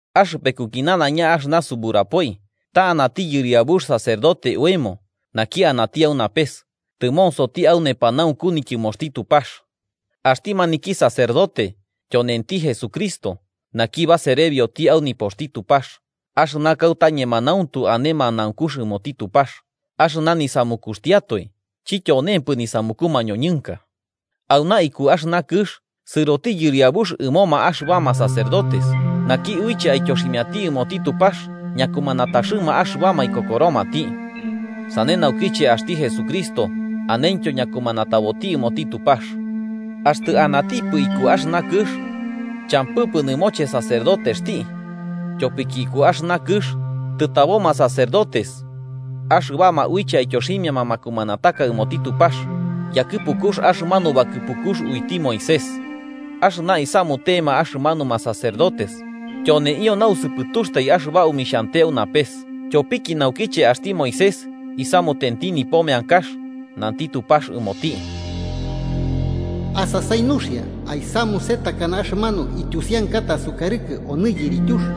Axɨpekuki nanaiña axɨna suburapoi ta anati yɨriabux sacerdote oemo naki anati au napes, tɨmonsoti au nepanaunku nityɨmoxti Tupax. Axti maniki sacerdote tyonenti Jesucristo, naki baserebioti au nipoxti Tupax, axɨna kauta ñemanauntu ane manaunkux ɨmoti Tupax, axɨna nisamukuxtiatoe chityonempɨ nisamuku mañoñɨnka. Auna iku axɨna kɨx, sɨroti yɨriabux ɨmoma axɨbama sacerdotes naki uiche aityoximiati ɨmoti Tupax ñakumanataxɨma axɨbama ikokoromati. Sane naukiche axti Jesucristo anentyo ñakumanataboti ɨmoti Tupax. Axtɨ anatipɨ iku axɨna kɨx, champɨpɨ nɨmoche sacerdotexti, tyopiki iku axɨna kɨx tɨtaboma sacerdotes axɨbama uiche aityoximiama makumanataka ɨmoti Tupax yakɨpukux axɨmanu bakɨpukux uiti Moisés. Axɨna isamutema axɨmanuma sacerdotes tyoneio nausɨpɨtuxtai axɨba omixhante au napes. Tyopiki naukiche axti Moisés isamutenti nipo meankax, nanti Tupax ɨmoti: “Asasai nuxia aisamuse takana axɨmanu ityusiankata asukarɨkɨ onɨ yirityux.”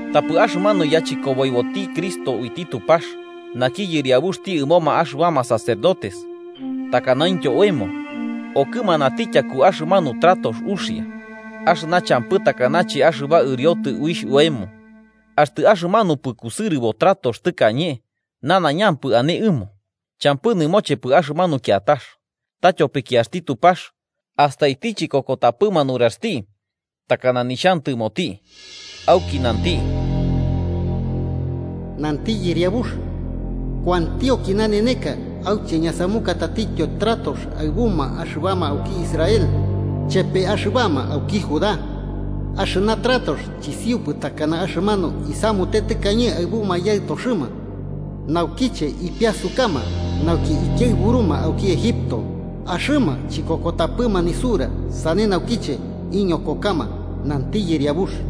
Tapɨ axɨmanu yachɨkoboiboti Cristo uiti Tupax, naki yɨriabuxti ɨmoma axɨbama sacerdotes takanaintyo oemo, okɨmanati tyaku axɨmanu tratox uxia, axɨna champɨ takanache axɨba ɨriotɨ uixh oemo. Axtɨ axɨmanupɨ kusɨrɨbo tratox tɨkañe nanaiñampɨ ane ɨmo, champɨ nɨmochepɨ axɨmanu kiatax. Ta tyopiki axti Tupax astaiti chikokotapɨma nuraxti takana nixhantɨmoti, auki nanti: “Nanti Yɨriabux: Kuantionki naneneka auche ñasamuka tatityo tratox aɨbuma axɨbama auki Israel chepe axɨbama auki Judá. Axɨna tratox chisiupɨ takana axɨmanu isamute tɨkañe aɨbuma yaɨtoxɨma, naukiche ipiasukama nauki ikiaɨburuma auki Egipto. Axɨma chikokotapɨma nisura, sane naukiche iñokokama, nanti Yɨriabux.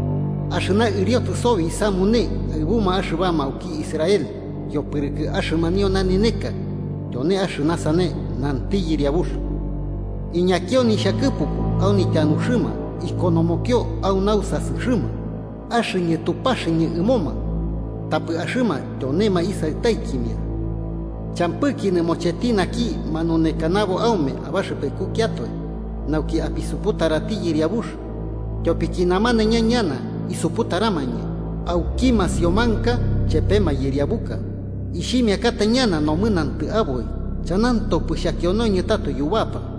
Axɨna ɨriotɨ sobi isamune aɨbuma axɨbama auki Israel yopɨrɨkɨ axɨmanio naneneka, tyone axɨna sane, nanti Yɨriabux: Iñakio nixhakɨpuku au nityanuxɨma ikonomokio au nausasɨxɨma. Axɨñɨ Tupaxɨñɨ ɨmoma tapɨ axɨma tyonema isaɨtaikimia. Champɨki nɨmocheti naki manunekanabo aume abaxɨpekukiatoe, nauki apisuputarati yɨriabux, tyopiki namanaiña ñana isuputaramañɨ, auki masiomanka chepe mayɨriabuka. Ixhimiakata ñana nomɨnantɨ aboi chanantopɨ xhakionoñɨ tato yubapa.”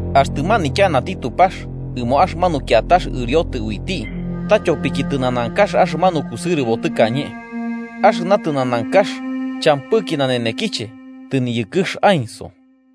Axtɨ manityanati Tupax ɨmo axɨmanu kiatax ɨriotɨ uiti ta tyopiki tɨnanankax axɨmanu kusɨrɨbo tɨkañe. Axɨna tɨnanankax champɨki nanenekiche, tɨniyɨkɨx aenso.